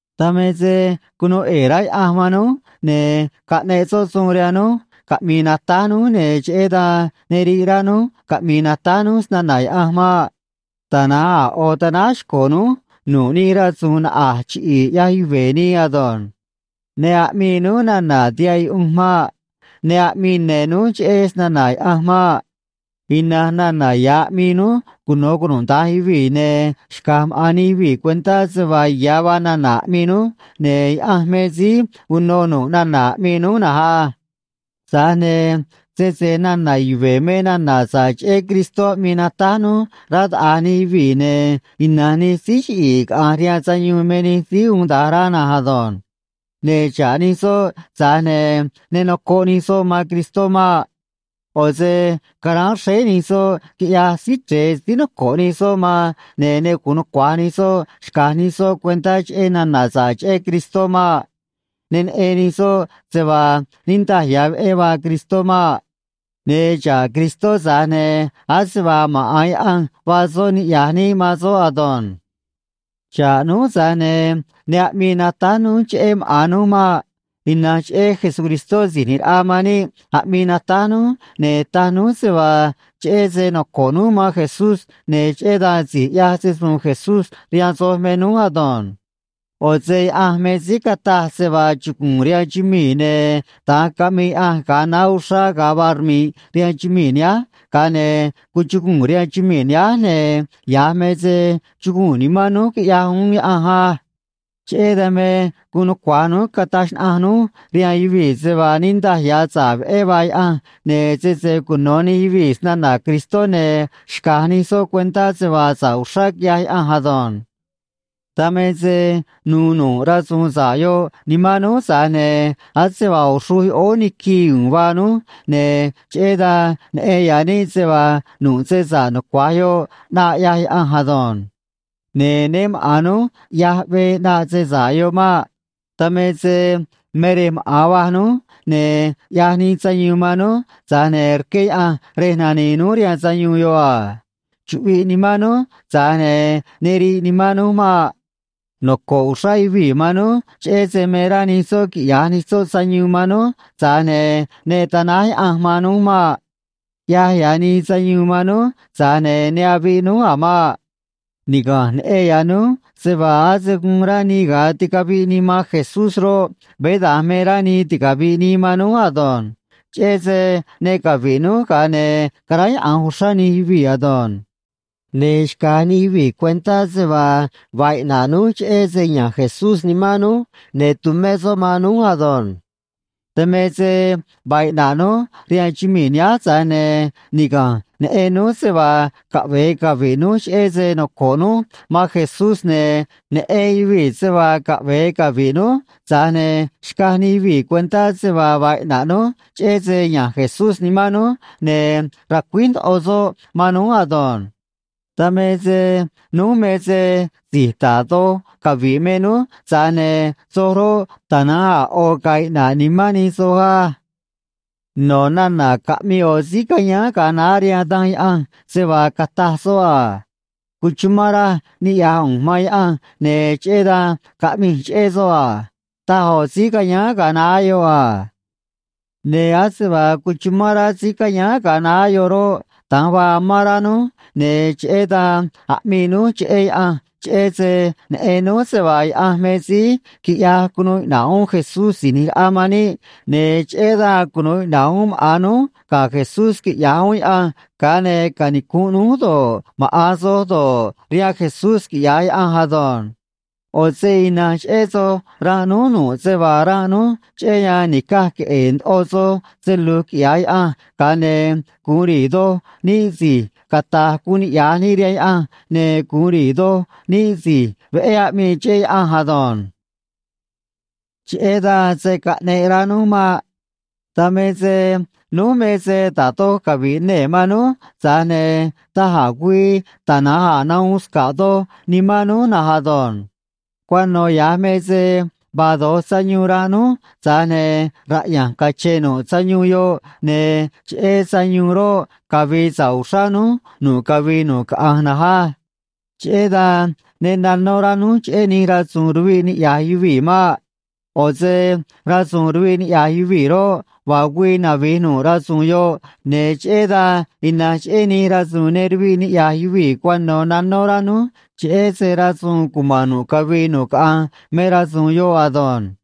Dan me se cunuu ꞌe̱e̱ rá Yaꞌanj man núj, ne̱ caꞌneꞌ soꞌ suun rihaan núj caꞌmi̱i̱ natáj núj, ne̱ cheꞌé dan ne riꞌ rá núj caꞌmi̱i̱ natáj núj snana̱ Yaꞌanj maꞌ. Tana̱nj a̱ ꞌo̱ tanáj xco̱ núj nu̱ꞌ nij rasu̱u̱n naꞌa̱j chiꞌi̱i̱ ꞌyaj yuve̱ nii ado̱nj. Ne aꞌmii núj nana̱ tihaꞌ yuꞌunj maꞌ. Ne aꞌmii ne̱ núj cheꞌé snana̱ Yaꞌanj maꞌ. Ina̱nj nana̱ ya̱ aꞌmii núj cuno̱ cunuda̱nj yuvii̱, ne̱ xca̱j maꞌa̱n nij yuvii̱ cuentá se vaa ya̱ vaa nana̱ aꞌmii núj, ne̱ Yaꞌanj me síí uno nu̱ꞌ nana̱ aꞌmii núj na̱nj á. Tza̱j ne̱ sese nana̱ yuve̱ me nana̱ sa̱ꞌ cheꞌé Cristó aꞌmii natáj núj, rá taꞌa̱j nij yuvii̱, ne̱ ina̱nj nij síí chiꞌi̱i̱ caꞌa̱nj rihaan sayuun me nij síí uun da̱nj rá na̱nj ado̱nj. Ne̱ xa̱ꞌ nij soꞌ, tza̱j ne̱ ne nocoꞌ nij soꞌ man Cristó maꞌ. ꞌO̱ se caráán xréé nij soꞌ, quiꞌyaj Síí Chre̱e síí noco̱ꞌ nij soꞌ man, ne̱ ne gu̱un nucua̱j nij soꞌ xca̱j nij soꞌ cuentá cheꞌé nana̱ sa̱ꞌ cheꞌé Cristó maꞌ. Ne neꞌen nij soꞌ se vaa niꞌndaj ya̱ veꞌé vaa Cristó maꞌ. Ne̱ xa̱ꞌ Cristó, tza̱j ne̱ ase vaa maꞌa̱n Yaꞌanj vaa soꞌ niꞌya̱j níꞌ man soꞌ ado̱nj. Xa̱ꞌ núj, tza̱j ne̱ ne aꞌmii natáj núj cheꞌé maꞌa̱n núj maꞌ. Ina̱nj cheꞌé Jesucristó Si̱j ꞌNi̱j Raꞌa man níꞌ aꞌmii natáj núj, ne̱ taj núj se vaa cheꞌé se noco̱ꞌ núj man Jesús, ne̱ cheꞌé dan si̱j ꞌyaj se‑su̱u̱n Jesús rihaan soj me núj ado̱nj. ꞌO̱ se Yaꞌanj me síí cataj se vaa chugu̱u̱n rihaan chumii̱, ne̱ da̱nj caꞌmii Yaꞌanj ga̱a naá uxrá ga̱a vaa rmi̱ꞌ rihaan chumii̱ nihánj, ga̱a ne̱ cuchuguu̱n rihaan chumii̱ nihánj, ne̱ ya̱j me se chuguu̱n nimán núj, quiꞌyaj uún Yaꞌanj á. Cheꞌé dan me guun nucua̱j núj cataj xnaꞌanj núj rihaan yuvii̱ se vaa niꞌndaj ya̱ sa̱ꞌ veꞌé vaa Yaꞌanj, ne̱ sese cuno̱ nij yuvii̱ snana̱ Cristó, ne̱ xca̱j nij soꞌ cuentá se vaa sa̱ꞌ uxrá quiꞌyaj Yaꞌanj ado̱nj. Dan me se nu̱u̱ nu̱ꞌ rasu̱u̱n sa̱ꞌ yoꞌ nimán núj, tza̱j ne̱ ase vaa ꞌo̱ xruj yoꞌóó niquii u̱u̱n vaa núj, ne̱ cheꞌé dan neꞌen ya̱ níꞌ se vaa nu̱ꞌ se sa̱ꞌ nucua̱j yoꞌ ꞌnaꞌ ꞌyaj Yaꞌanj ado̱nj. Ne̱ né maꞌa̱n núj ꞌyaj veé ꞌnaꞌ se sa̱ꞌ yoꞌ maꞌ. Dan me se me rej maꞌa̱n va̱j núj, ne̱ ꞌyaj nii sayuun man núj, tza̱j ne̱ rqué Yaꞌanj rej nani̱i̱ núj rihaan sayuun yoꞌ a. Chuꞌviꞌ nimán núj, tza̱j ne̱ ne riꞌ nimán núj maꞌ. Noco̱ꞌ uxrá yuvii̱ man núj cheꞌé se me rá nij soꞌ quiꞌya̱j nij soꞌ sayuun man núj, tza̱j ne̱ ne tanáj Yaꞌanj man núj maꞌ. ꞌYaj ya̱ nii sayuun man núj, tza̱j ne̱ ne aviꞌ núj a̱ maꞌ. Niga̱nj neꞌen ya̱ núj se vaa ase guun rá nii ga̱a ticaviꞌ nii man Jesús roꞌ, veé da̱nj me rá nii ticavi̱ꞌ nii man núj ado̱nj. Cheꞌé se ne cavi̱ꞌ núj, ga̱a ne̱ caráyaꞌa̱nj uxrá nij yuvii̱ ado̱nj. Ne̱ xca̱j nij yuvii̱ cuentá se vaa vaa iꞌna̱ꞌ núj cheꞌé se ya̱nj Jesús nimán núj ne̱ tumé soꞌ man núj ado̱nj. Dan me se vaa iꞌna̱ꞌ núj rihaan chumii̱ nihánj, tza̱j ne̱ niga̱nj neꞌen núj se vaa caꞌve̱e cavi̱ꞌ núj cheꞌé se noco̱ꞌ núj man Jesús, ne̱ neꞌen yuvii̱ se vaa caꞌve̱e cavi̱ꞌ núj, tza̱j ne̱ xcaj nij yuvii̱ cuentá se vaa vaa iꞌna̱ꞌ núj cheꞌé se ya̱nj Jesús nimán núj ne̱ racuíj ndoꞌo soꞌ man núj ado̱nj. Dan me se núj me se si̱j da̱j doj cavi̱ꞌ me núj, tza̱j ne̱ soj roꞌ, tana̱nj a̱ ꞌo̱ ga̱a̱ iꞌna̱ꞌ nimán nij soj á. No̱ nana̱ caꞌmii ꞌo̱ síí cayáán ga̱a naá rihaan Danj Yaꞌanj se vaa cataj soꞌ a: “Cuchumán raj niꞌya̱j ꞌu̱nj man Yaꞌanj, ne̱ cheꞌé dan caꞌmij cheꞌé soꞌ a”, taj ꞌo̱ síí cayáán ga̱a naá yoꞌ a. Ne̱ ase vaa cuchumán rá síí cayáán ga̱a naá yoꞌ roꞌ, da̱nj vaa amán rá núj, ne̱ cheꞌé dan aꞌmii núj cheꞌé Yaꞌanj, cheꞌé se neꞌen núj se vaa Yaꞌanj me síí quiꞌyaj cunuu iꞌna̱ꞌ uún Jesús Si̱j ꞌNi̱j Raꞌa man níꞌ, ne̱ cheꞌé dan cunu̱u iꞌna̱ꞌ uún maꞌa̱n núj ga̱ Jesús, quiꞌya̱j uún Yaꞌanj, ga̱a ne̱ canicu̱nꞌ núj do̱ꞌ, maꞌa̱n soj do̱ꞌ, rihaan Jesús, quiꞌya̱j Yaꞌanj ado̱nj. ꞌO̱ se ina̱nj cheꞌé soj ranꞌ núj nu̱ꞌ se vaa ranꞌ núj, cheꞌé yan ni̱caj queꞌe̱e̱ ndoꞌo soj se lu̱j quiꞌya̱j Yaꞌanj, ga̱a ne̱ gu̱un ri̱i̱ doj níꞌ si̱j cata̱j guun niꞌya̱j níꞌ rihaan Yaꞌanj, ne̱ gu̱un ri̱i̱ doj níꞌ si̱j veꞌé aꞌmii cheꞌé Yaꞌanj ado̱nj. Cheꞌé dan se̱ caꞌneꞌ rá núj maꞌ. Dan me se núj me se da̱j doj cavi̱ꞌ nee̱ man núj, tza̱j ne̱ da̱j a̱ güii tana̱nj a̱ nahuun sca̱ꞌ doj nimán núj na̱nj ado̱nj. Cuano̱ ya̱j me se vaa do̱j sayuun ranꞌ núj, tza̱j ne̱ raꞌya̱nj cache̱n nu̱ꞌ sayuun yoꞌ, ne̱ cheꞌé sayuun roꞌ, cavi̱i̱ sa̱ꞌ uxrá núj nu̱ꞌ cavii nu̱ꞌ caꞌanj na̱nj á. Cheꞌé dan ne nanó rá núj cheꞌé nij rasu̱u̱n ruviꞌ niꞌya̱j yuvii̱ maꞌ. ꞌO̱ se rasu̱u̱n ruviꞌ niꞌya̱j yuvii̱ roꞌ, vaa güii navi̱j nu̱ꞌ rasu̱u̱n yoꞌ, ne̱ cheꞌé dan ina̱nj cheꞌé nij rasu̱u̱n ne ruviꞌ niꞌya̱j yuvii̱ cuano̱ nanó rá núj, cheꞌé se rasu̱u̱n cuma̱n nu̱ꞌ cavii nu̱ꞌ caꞌanj me rasu̱u̱n yoꞌ ado̱nj.